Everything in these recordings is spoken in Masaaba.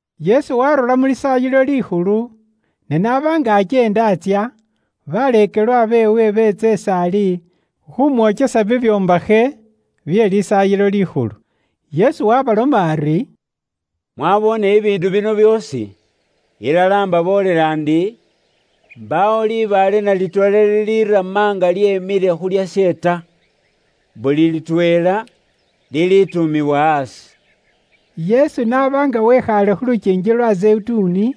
Yesu waarura mu Lisaayilo Likhulu, ne n'aba nga akyeenda atsya, baleekelwa beewe beetsa is'ali khumwokyesa bibyombakhe bye Lisaayilo Likhulu. Yesu waabaloma ari, “Mwaboone bibiindu bino byoosi? Ilala imbaboolela ndi, mbaawo libaale na litweela lilirama nga lyemile khu lyashe ta! Buli litweela lilituumiwa aasi.” Yesu n'aba nga wekhaale khu lukiingi lwa Zeyituni,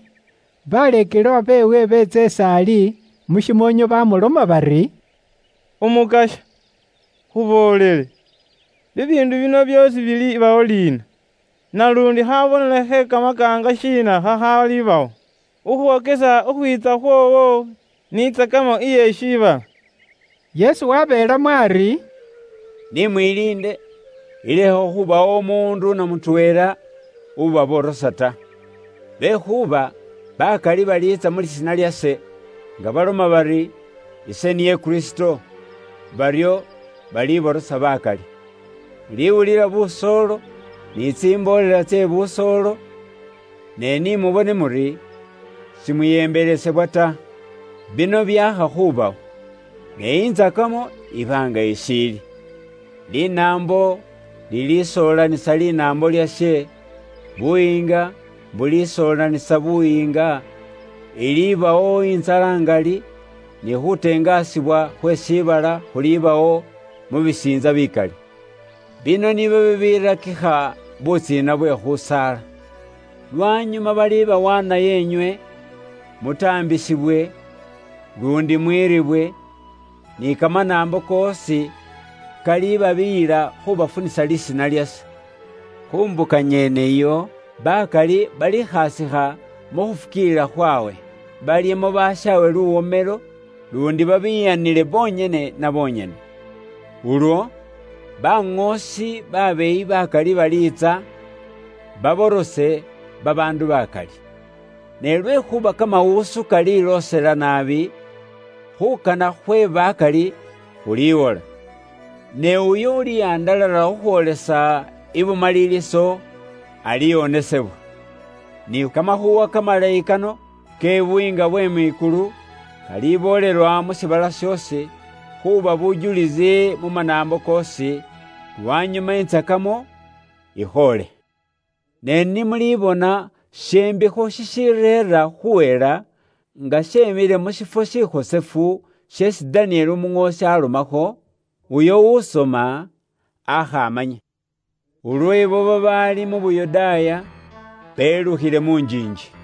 baleekelwa beewe beetsa is'ali mu shimoonyo bamuloma bari, “Umukasya, khuboolele, bibiindu bino byoosi bilibawo liina, naluundi khabonelo khe kamakaanga shiina khakhalibawo khukhwokesa khukhwiitsa khwoowo, ni intsakamo iye shiibala?” Yesu wabeelamo ari, “Ni mwiliinde ilekhe khubawo umuundu namutweela ubaborosa ta. Lwekhuuba bakali baliitsa mu lisiina lyase, nga baloma bari, ‘Ise niye Kristo,’ baryo baliborosa bakali. Muliwulila busoolo ni tsimboolela tse busoolo, ne ni mubone muri simuyembelesebwa ta. Bino byaakha khubawo, ne intsakamo iba nga ishiili. Linaambo lilisoolanisa linaambo lyashe, buyiinga bulisoolanisa buyiinga, iliibawo intsala ngali, ni khutengasibwa khwe shiibala khulibawo mu bisiintsa bikali. Bino nibyo bibirakikha butsiina bwe khusaala. “Lwanyuma balibawaanayo inywe, mutaambisibwe, luundi mwiriibwe, ni kamanaambo koosi kalibabiyila khubafunisa lisiina lyase. Khu mbuka nyene iyo, bakali balikhasikha mu khufukiilila khwawe, balyemo bashaawe luwomelo, luundi babiyanile bonyene na bonyene. Ulwo, baŋoosi be bubeeyi bakali baliitsa, baborose babaandu bakali. Ne lwekhuuba khukhola bye bubwoonaki bililoosela naabi, khuukana khwe bakali khuliwamo kamaani. Ne uyo ulihandalala khukhwoolesa ibumaliliso, aliwonesebwa. Ni kamakhuuwa kamalayi kano ke Buyiinga bwe mwikulu, kaliboolelwa mu shiibala shoosi, khuuba bujulisi mu manaambo koosi, lwanyuma intsakamo ikhoole. “Ne ni mulibona she mbikho shishireera khuhela nga shemile mu shiifwo shikhosefu sheesi Danieli umuŋoosi alomakho. (Uyo usoma aakha amanye.) Ulwo ibo babaali mu Yuda belukhile mu njiinji.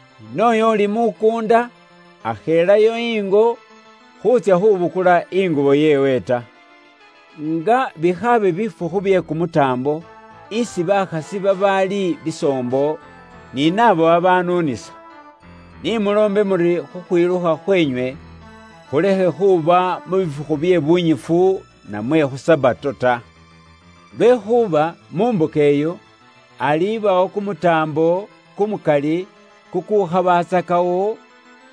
Ni nooyo uli mu mukuunda akhelayo ingo khuutsya khubukula ingubo yeewe ta. Nga bikhaabe bifukhu bye kumutaambo isi bakhasi babaali bisoombo, ni naabo babanuunisa. Ni muloombe muri khukhwilukha khweenywe khulekhe khuba mu bifukhu bye bunyifu namwe khu Sabato ta. Lwekhuuba mu mbuka iyo, ilibawo kumutaambo kumukali kukukhabatsakawo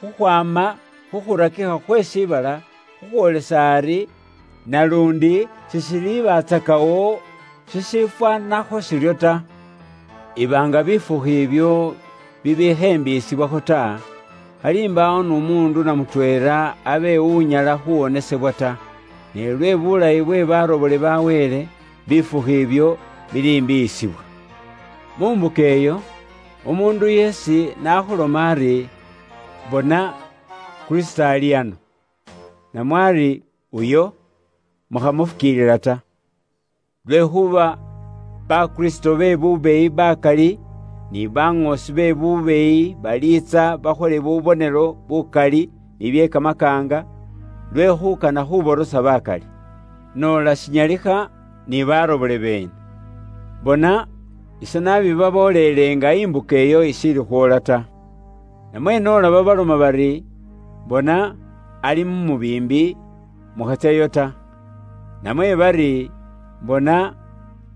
khukhwaama khu khurakikha khwe shiibala khukhwoolesa ari, naluundi sishilibatsakawo shishifwaanakho shiryo ta. Iba nga bifukhu ibyo bibikhembiiyisibwakho ta, khali mbaawo n'umuundu na mutweela abe unyala khuwonesebwa ta, ne lwe bulayi bwe barobole ba Wele, bifukhu ibyo bilimbiiyisibwa. “Mu mbuka iyo, umuundu yeesi nakhuloma ari, ‘Bona, Kristo ali ano,’ namwe ari, ‘Uyo,’ mukhamufukiilila ta. Lwekhuuba ba kristo be bubeeyi bakali ni baŋoosi be bubeeyi baliitsa bakhole bubonelo bukali ni bye kamakaanga, lwe khuukana khuborosa bakali. Noola shinyalikha, ni barobole beene. Bona, ise nabibabooleele nga imbuka iyo ishiili khwoola ta. “Namwe noola babaloma bari, ‘Bona, ali mu mubiimbi,’ mukhatsyayo ta. Namwe bari, ‘Bona,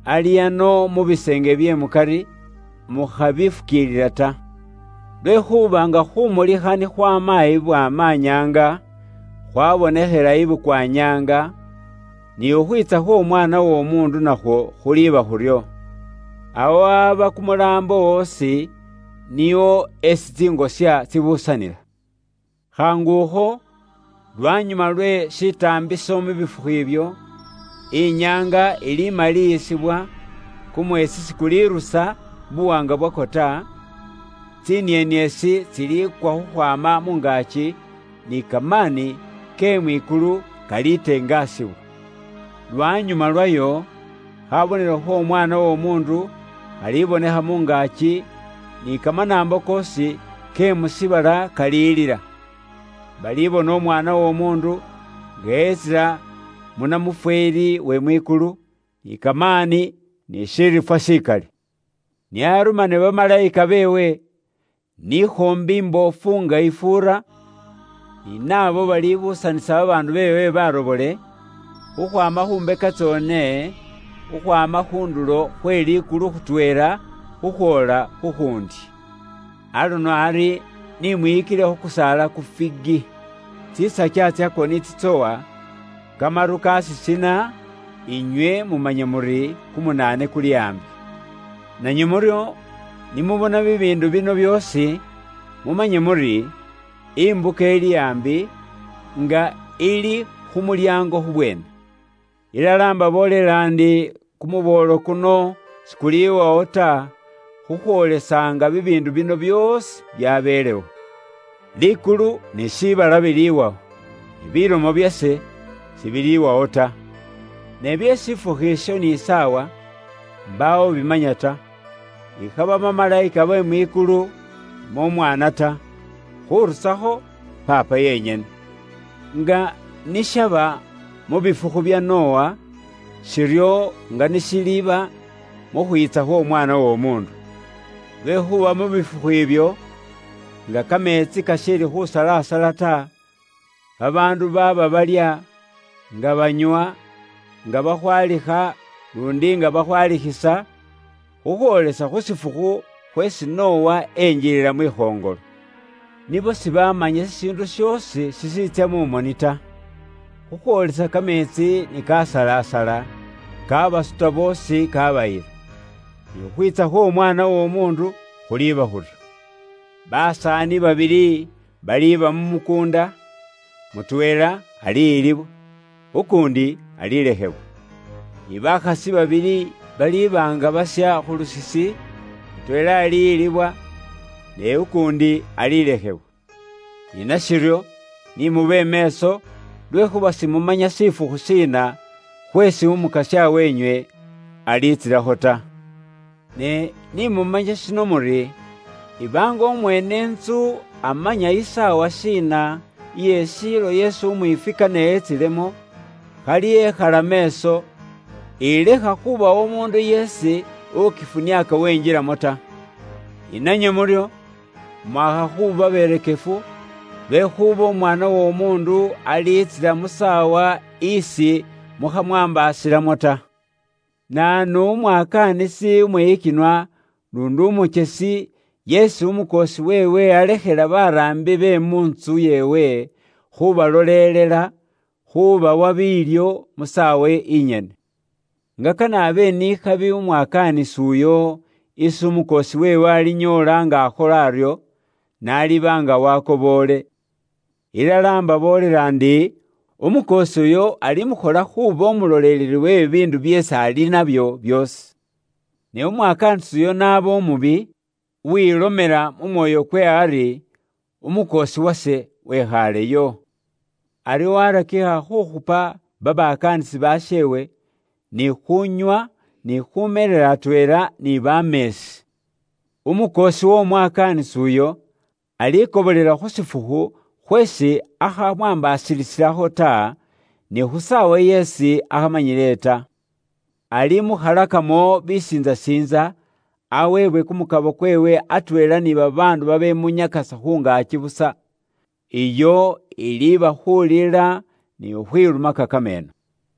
ali ano mu biseenge bye mukari,’ mukhabifukiilila ta. Lwekhuuba nga khumulikha ni khwaama ibwaamanyaanga, khwaabonekhela i bukwanyaanga, ni khukhwiitsa khw'Omwaana w'Omuundu nakhwo khuliiba khuryo. Awo aba kumulaambo osi, niwo esi tsingosya tsibuusanila. “Khaangukho lwanyuma lwe shitaambiso mu bifukhu ibyo, inyaanga ilimaliyisibwa, kumweesi sikulirusa buwaanga bwakwo ta, tsinieniesi tsiliikwa khukhwaama mu ngaaki, ni kamaani ke mwikulu kalitengasibwa. Lwanyuma lwayo, khabonelo kh'Omwaana w'Omuundu khalibonekha mu ngaaki, ni kamanaambo koosi ke mu shiibala kalilila. Balibona Umwaana w'Omuundu nga etsila mu namufweeli we mwikulu, ni kamaani ni shiriifwa shikali. Nio arumane bamalayika beewe, n'ikhoombi imboofu nga ifuura, ni nabo balibuusanisa babaandu beewe barobole, khukhwaama khu mbeka tsoone, khukhwaama khu ndulo khwe likulu khutweela khukhwoola khu khuundi. “Aluno ari, ni mwiyikile khu kusaala ku Figi. Tsisakya tsakwo ni tsitsowa, kamaru kasisina, inywe mumanya muri kumunaane kuli aambi. Nanywe muryo, ni mubona bibiindu bino byoosi, mumanye muri, imbuka ili aambi, nga ili khu mulyaango khubweene. Ilala imbaboolela ndi, kumuboolo kuno sikuliwawo ta, khukhwoolesa nga bibiindu bino byoosi byabelewo. Likulu ni shiibala biliwawo, ne bilomo byase sibiliwawo ta. “Ne bye shifukhu isho ni saawa, mbaawo ubimanya ta, ikhaba bamalayika be mwikulu namwe Umwaana ta, khurusakho Paapa yenyene. Nga ni shaba mu bifukhu bya Nowa, shiryo nga ni shiliiba mu khwiitsa khw'Omwaana w'Omuundu. Lwekhuuba mu bifukhu ibyo, nga kameetsi kashiili khusalasala ta, babaandu baaba balya, nga banywa, nga bakhwalikha luundi nga bakhwalikhisa, khukhwoolesa khu shifukhu khweesi Nowa enjilila mwikhoŋolo. Nibo sibamanya shishiindu shoosi shishiitsya mu moni ta, khukhwoolesa kameetsi ni kasalasala, kabasuta boosi kabayila. Ni khukhwiitsa khw'Omwaana w'Omuundu khuliiba khuryo. Basaani babili baliiba mu mukuunda, mutweela aliyilibwa, ukuundi alilekhebwa. Ni bakhasi babili baliiba nga basya khu lusisi, mutweela aliyilibwa, ne ukuundi alilekhebwa. Ni nashiryo, ni mube meeso, lwekhuuba simumanya shifukhu shiina khweesi Umukasya weenywe aliitsilakho ta. Ne ni mumanye shino muri, iba nga umweene intsu amanya isaawa shiina iye shiilo yeesi umwiifwi kane etsilemo, khali ekhala meeso, ilekha khubawo umuundu yeesi ukifuniaaka wenjilamo ta. Ni nanywe muryo, mwakha khuuba berekefu, lwekhuuba Umwaana w'Omuundu aliitsila mu saawa isi mukhamwaambaasilamo ta. “Naanu umwakaanisi umwiyikinwa luundi umukyesi yeesi umukoosi weewe alekhela baraambi be mu ntsu yeewe khubalolelela, khubawa biilyo mu saawa inyene? Nga kane abe ni khabi umwakaanisi uyo isi umukoosi weewe alinyoola nga akhola aryo, n'aliba nga wakoboole. Ilala imbaboolela ndi, umukoosi uyo alimukhola khuuba umuloleleli we bibiindu byeesi ali nabyo byoosi. Ne umwakaanisi uyo n'aba umubi, uwilomela mu mwoyo kweewe ari, ‘Umukoosi wase wekhaaleyo,’ aryo warakikha khukhupa babakaanisi basheewe, ni khuunywa ni khumeelela atweela ni bameesi. Umukoosi w'omwakaanisi uyo alikobolela khu shifukhu khweesi akhamwaambasilisilakho ta, ni khu saawa yeesi akhamanyile ta. Alimukhalakamo bisiintsasiintsa, aweebwe kumukabo kweewe atweela ni babaandu babemunyakasa khu ngaaki busa. Iyo iliiba khulila ni khukhwilumaka kameeno.